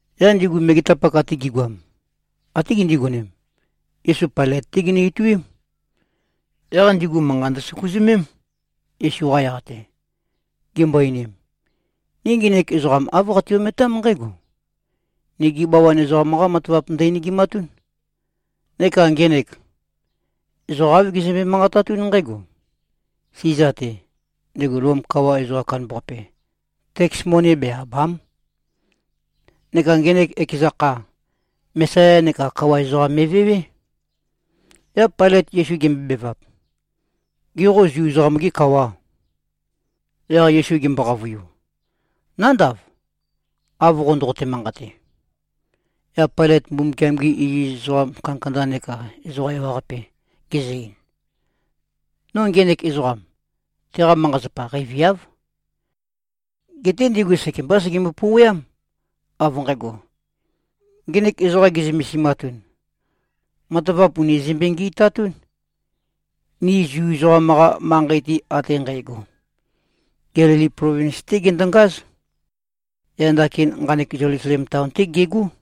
Yaq ndigu megetapak ate gi꞉goam, até gindigonem, Yesu Pailøt-té ginø-ituím. Yaq ndigu manqa ndøsøkuzømém, Yesu-qa yaq-te, gimbo-einim, “Ni ngenek ezoqam āv qati-ometám nqǽgo. Nigi bawan ezoqam-qá matavap ndø-enegimatún. Neka ngenek, ezoqa āv gezømbe-manqatatún nqǽgo: Siza-te, ndego Lom kawa ezoqam kandambaqape, teks moni be-àba᷄m. Neka ngenek ekeza kha, Mesaya neka kawa ezoqam me꞉vewé.” Yaq Pailøt Yesu gembobevap, “Gê, qo Zu ezoqam-gê kawà?” Yaq Yesu gembo-qavøiu, “Nándav, av qo ndoqote-manqate.” Yaq Pailøt Mbumbukiam-gi iziz ezoqa kandakanda neka ezoqa ewaqape gezø-ein, “No ngenek ezoqam, teqa manqa-zapa qeiviáv.” Geté ndigu sekembá segembo-pouweám, av nqægo, “Ngenek ezoqa ge꞉zømesimatun, matavap ùni zømbe-ngi꞉tatún, ni Zu ezoqam-qa manqei-te ate nqægo. Gelili plovins-té gendongáz. Yaq ndakin nqanek Zelusalem taon-té gegó.”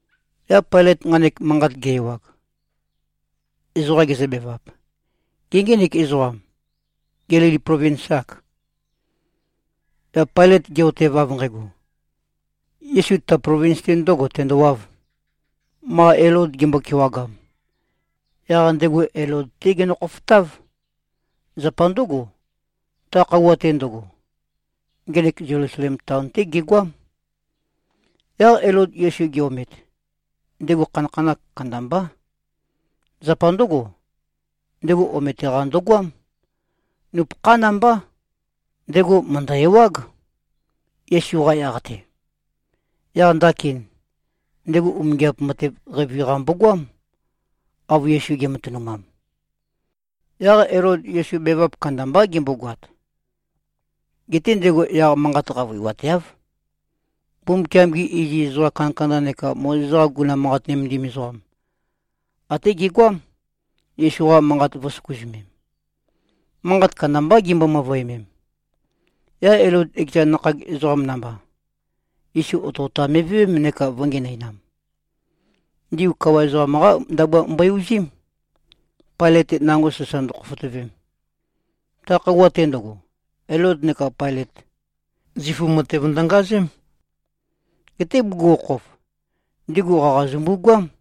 Yaq Pailøt nqanek manqat ge-ewag, ezoqa gezøbevap, “Gê, ngenek ezoqam, Gelili plovins-âk?” Yaq Pailøt ge꞉-otev av nqægo, Yesu ta plovins-te ndø̄go tendowāv, ma Elod gembo-kewagam, yaq ndego Elod-té genø-khofotáv. Zapa ndǿgo, ta khøuwa-te ndøgo, ngenek Zelusalem taon-té gegoám. Yaq Elod Yesu ge-omet, ndego khanakhanakh kandambá. Zapa ndǿgo, ndego omete-qa ndøgoám. Nupøkhán mbá. Ndego mø̀ndø-ewág, Yesu-qa yaq-te. Yaq ndakin, ndego umingiap matev qeivi-qa mbogoám, av Yesu ge꞉matønumam. Yaq Elod Yesu bevap kandambá gembogoat. Geté ndego yaq manqat qavøiwateáv. Mbumbukiam-gi iziz ezoqa kandakanda neka Mozes-qa guguna manqat nømendim ezoqam, até gegoám, Yesu-qa manqa vø̄søkuzømem. Manqat kandambá gimbøe-møvøemem. Yaq Elod ekeza nakhag ezoqam namba, Yesu otøotam me꞉vewém neka vø̄ngenøinam. Ndigu kawa ezoqam-qá ndabua mbo-uzím, Pailøt-te nango sasa ndøkhofotøvem. Ta khøuwa-te ndøgo, Elod neka Pailøt, zifu matev ndøngazém. Geté bugukhokhof, ndigu qaqa zømbugoám.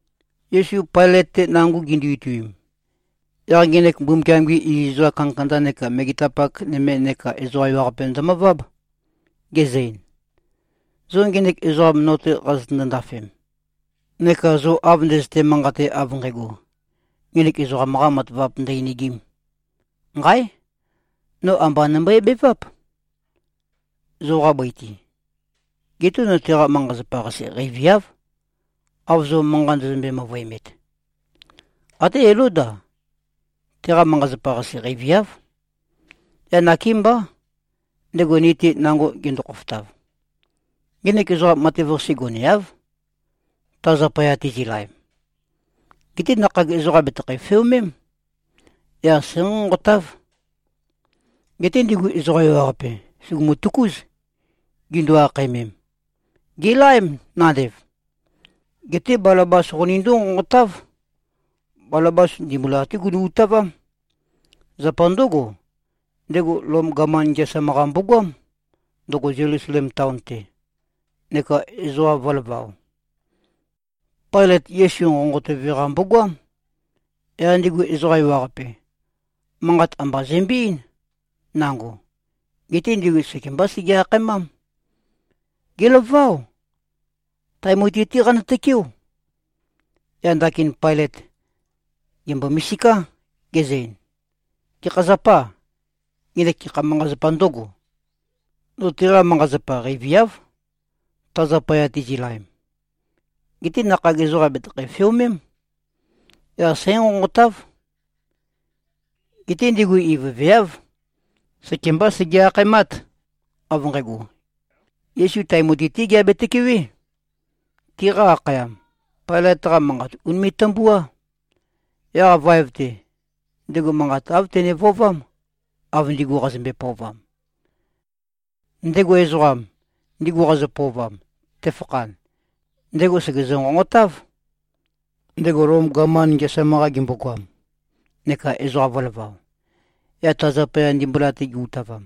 Yesu Pailøt-te nango gindu-ituim, yaq ngenek Mbumbukiam-gi iziz ezoqa kandakanda neka megetapak nøme neka ezoqa ewaqape ndømøváb, gezø-ein, “Zo ngenek ezoqam no-te qazøtøndo-ndafem, neka zo av ndøzøte-manqate av nqægo, ngenek ezoqam-qā matavap ndø-enegīm, nqáe! No amba nømbøe-beváp, zoqa bøi-te. Geté no teqa manqa-zapa-qase qeiviáv, av zo manqa ndøzømbøe-møvøemet. Até Elód-a, teqa manqa-zapa-qase qeiviáv. Yaq nakémbá, ndego ni-te nango gendo-khofotav. Ngenek ezoqam matev-qase goneáv, ta zapaya tizi꞉laem. Geté nakhag ezoqam bètøkho-feomém. Yaq sǽnqonqotáv.” Geté ndigu ezoqa ewaqape sùgumu-tøkúz, gindu-akhaemem, “Gèlaém nandev. Geté Balabas qonindó-nqonqotáv.” Balabas ndimbula-té gunu-utavám. Zapa ndǿgo, ndego Lom gaman ngeasam-qa mbogoám, ndøgo Zelusalem taon-te, neka ezoqa vø̄lavao. Pailøt Yesu nqonqotøve-qa mbogoám. Yaq ndego ezoqa ewaqape, manqat amba zømbe-eín, nango. Geté ndigu sekembá sege-akhaemám, “Gèlaváo. Tae mutui-té qanø-tøkeó!” Yaq ndakin Pailøt gèmbo-misiká, gezø-ein, “Gekha zapâ? Ngenek gekha manqa-zapā ndǿgo? No teqa manqa-zapa qeiviáv, ta zapaya tizi꞉laem. Geté nakhag ezoqam bètøkho-feomém. Yaq sǽnqonqotáv.” Geté ndigu ivøveáv. Sekembá sege-akhaemát, av nqægo, Yesu tae mutui-té geabe-tøkewé. Tiqa akhayam, Pailøt-qa manqat ùnime꞉-tømbuá. Yaq vaev-te, ndego manqa āv tene-vøovám, av ndigu qazømbe-pøovam. Ndego ezoqam, ndigu qazø-pøovam, tefakhan, ndego sègezø-nqonqotáv, ndego Lom gaman ngeasam-qa gembogoam neka ezoqa vø̄lavao, yaq ta zapaya ndimbula-te gi-utavam.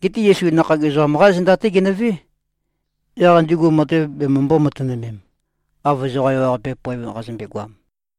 Geté Yesu nakhag ezoqam-qá zenda-té genøvé, yaq ndigu matev bemømbō-matønømem, av ezoqa ewaqape poev qazømbe-goam.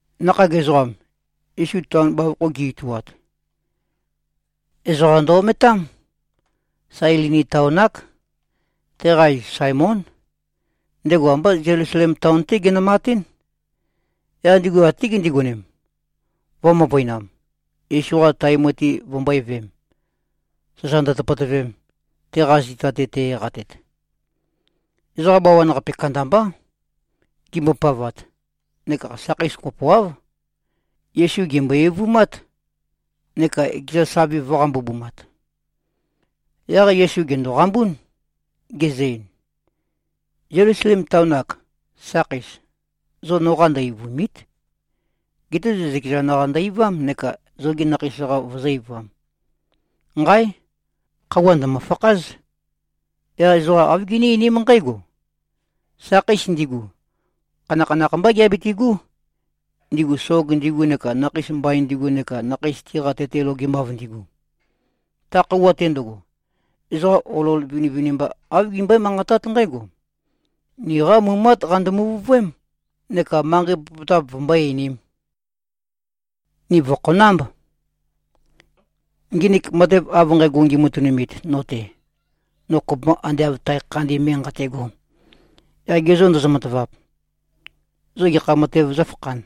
Nakhag ezoqam, Yesu taon bavokho gi-ituat, ezoqa ndø-ometám. Sailini taon-ák. Teqa iz Saemón. Ndego ambá Zelusalem taon-té genømatín. Yaq ndigu até gindigonem, vø̄-møvøinam, Yesu-qa tae mutui vømbø̄e-veem, sasa ndøtøpøtøvem, teqa zita-te te-eqatet. Ezoqa bawan-qape kandambá, gimbopavat. Neka sakheis kopoáv, Yesu gèmbo-eivumát, neka ekeza savi vø̄-qambubumat. Yaq Yesu gèndoqambún, gezø-ein, “Zelusalem taon-ak, sakheis, zo noqā ndø-eivùmi᷄t. Geté zo zøkezan-qa ndø-eivám neka zogi nakheis-qa vozó-eivām. Nqáe! Khøuwa ndø̀mø-fakház. Yaq ezoqa āv giní-einím nqǽgo, ‘Sakheis ndigu, khanakhanakh mbá giabitigú, ndigu sog ndigu neka nakheis mbain ndigu neka nakheis tiqa tete logemav ndigu.’ Ta khøuwa-te ndøgo, ezoqa olol vinivinimba, āv gimbøé-manqatát nqǽgo, ‘Niqá mumát qando-muvuvøém’ neka manqei popotap vømbó-einīm, ‘Ni vø̀khonámb.’ Nginik matev av nqægo ngimatønumit no-te, no kopømba ande av tae khandin me nqate꞉go, yaq ge zô ndozo-matavap, zo gekha matēv zǿfakhān,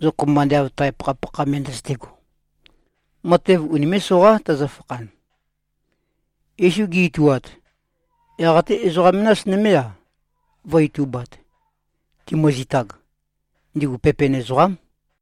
zo kopømba ande av tae pakhapakha me ndøzøte꞉go? Matev unimé꞉-soqá tøzøfakhan.” Yesu gi-ituat, yaq até ezoqa menas nømé-a, vø̄-itubat, timøzitag. Ndigu pepen ezoqám.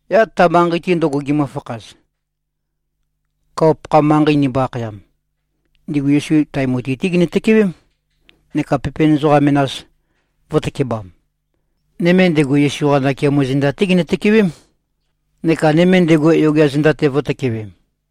Yaq ta manqei-te ndøgo gimøfakhaz, kawa-pakha manqei ndimbo-akhayam, ndigu Yesu tae mutui-té ginø-tøkewém, neka pepen ezoqa menas, vø̄tøkebam. Nøme ndego, Yesu-qa nakeamo zenda-té ginø-tøkewém, neka nøme ndego yogea zenda-te vø̄tøkewem.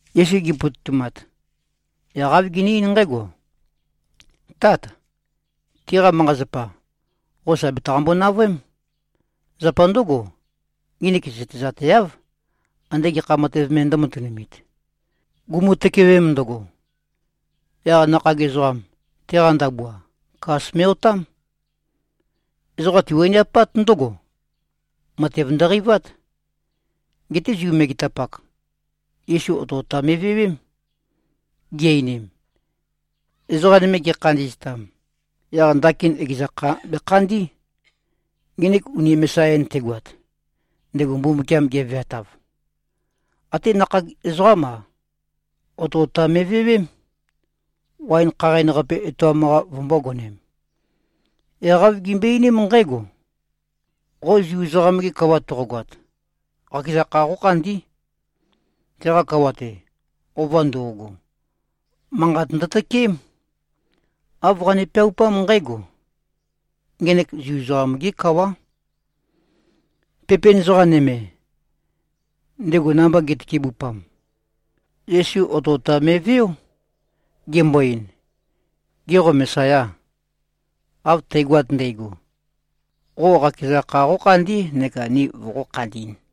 Yesu gi꞉pototumat, yaq āv gene-eín nqǽgo, “Tát. Tiqa manqa-zapa, qo sà betaqambo-navøém. Zapa ndǿgo, nginik zøtezateáv, andē gekha matev me ndø̄matunumit.” Gumu-tøkewem ndøgo, yaq nakhag ezoqam, teqa ndabua, kas me꞉-otám. Ezoqa tiwaniapát ndǿgo. Matev ndøqeivát. Geté Zu megetapak, Yesu otøotam me꞉vewém, gi-einim, “Ezoqa nøme gekhandi꞉ztam, yaq ndakin ekeza kha bekhandí, ngenek uni Mesaya-in tegoat, ndego Mbumbukiam geveatav.” Até nakhag ezoqám-a, otøotam me꞉vewém, waen khaqain-qape etoam-qa vømbōgonem. Yaq āv gimbøe-einím nqǽgo, “Qo Zu ezoqam-ge kawa toqogoat, qakeza kha qókhandí.” Teqa kawa-te, ova ndo꞉go, manqat ndøtøkeém. Āv qane-peaupám nqǽgo, “Ngenek Zu ezoqam-gé kawá.” Pepen ezoqa nøme, ndego namba gi꞉tøkebupam, Yesu otøotam me꞉veó, gembo-ein, “Gê, qo Mesayâ? Av tægoat ndægo, qo qakeza kha qókhandí neka ni voqó-khandī꞉n.”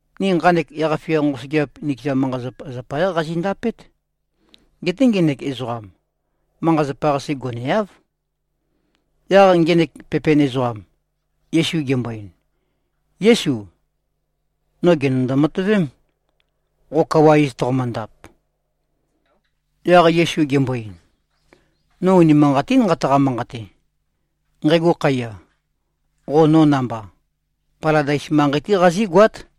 Ni nqanek yaq-fia nqosøgeap, nikeza manqa-zapa zapayá qazindapét. Geté ngenek ezoqam, manqa-zapa-qase goneáv.” Yaq ngenek pepen ezoqam, Yesu gembo-ein, “Yésu. No gènøndo-matøvém, qo kawa iz toqomøndap.” Yaq Yesu gembo-ein, “No unimanqatín nqataqa-manqate. Nqægo khøuwa, qo no namba, Paladais manqei-té qazígoát.”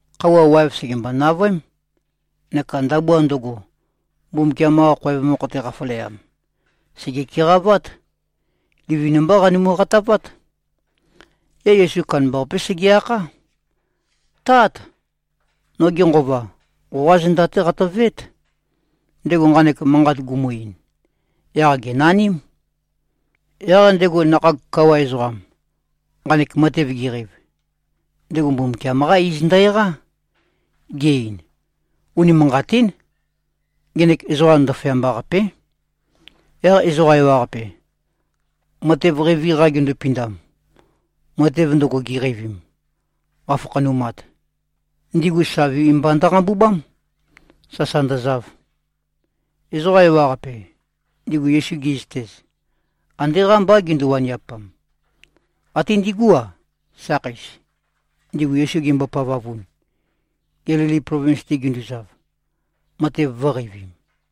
Khøuwa waev sègembo-navøém. Neka ndabua ndøgo, Mbumbukiam-qa khoev mokho-te qafaleam, sège-keqavát. Livin-mbá qanumu-qatavát. Yaq Yesu kandambaqapé sege-akhá, “Tát! Noge nqova, qoqá zenda-té qatøveét.” Ndego nqanek manqat gumu-ein, yaq gènaním. Yaq ndego nakhag kawa ezoqam, nqanek matev geqeiv, ndego Mbumbukiam-qá iz ndø-eqá, ge-ein, “Unimanqatín. Ngenek ezoqam ndaføyamba-qapé.” Yaq ezoqa ewaqape, matev qeivi-qa gindupindam, matev ndøgo giqeivim, qafakhanumat, ndigu savi mba ndøqambubám, sasa ndøzav. Ezoqa ewaqape, ndigu Yesu gi꞉zøtez, ande qámbá gindu-waniapam. Até ndigú-a, sakheis, ndigu Yesu gimbo-pavavun, Gelili plovins-te ginduzav, matev vø̄qeivim.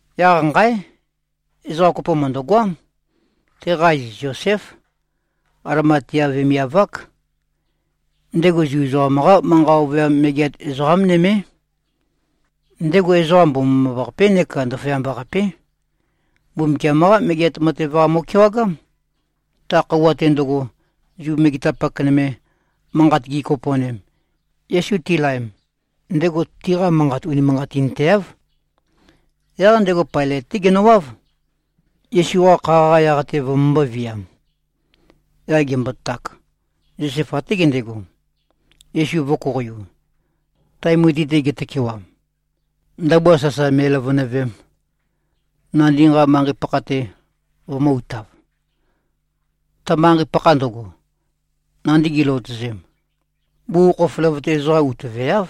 Yaq nqáe! Ezoqa kopo mø̀ndøgoám. Teqa iz Zoséf. Alimatea vemiav-ák. Ndego Zu ezoqam-qá manqa ovøyam megeat ezoqá nømé. Ndego ezoqa mbomambaqapé neka ndaføyamba-qapé. Mbumbukiam-qá Megeat Matev-qa mo꞉kewagám. Ta khøuwa-te ndøgo, Zu megetapak nøme, manqat gikopo꞉nem, Yesu tilaem, ndego tiqa manqat unimanqatinteáv. Yaq ndego Pailøt-té genøwáv, Yesu-qa kha-qa yaq-te vømømbō-viam. Yaq gembotak, Zosef até gendego, Yesu vø̄koqoiu, tae mutui-te getøkewam, ndabua sasa me꞉løvønøvem, nandi nqa manqei-pakha-te vømø̄-utav. Ta manqei-pakha ndøgo, nandi giløotøzem, bugukhokhof løvøte ezoqa utøveáv.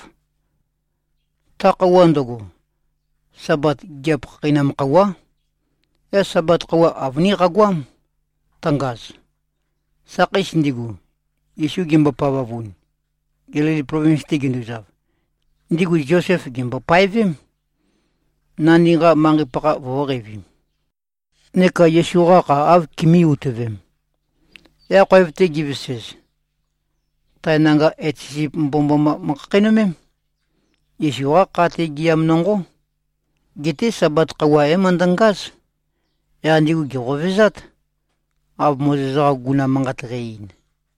Ta khøuwa ndøgo, Sabat gigiap khakheinam khøuwá. Yaq Sabat khøuwa avønín qagoám, tøngaz. Sakheis ndigu, Yesu gimbo-pavavun, Gelili plovins-te ginduzav, ndigu Zosef gèmbo-paevém, nandi nqa manqei-pakha vø̄qeivim, neka Yesu-qa kha āv kimī-utøvem. Yaq khoev-te givesez, tae nanga etet sisip mbomømboma møkhakheinømém. Yesu-qá kha-te gɨam nonqó. Geté Sabat khøuwa é-møndøngáz. Yaq ndigu gèqovezát, av Mozes-qa guguna manqat qæ-ein.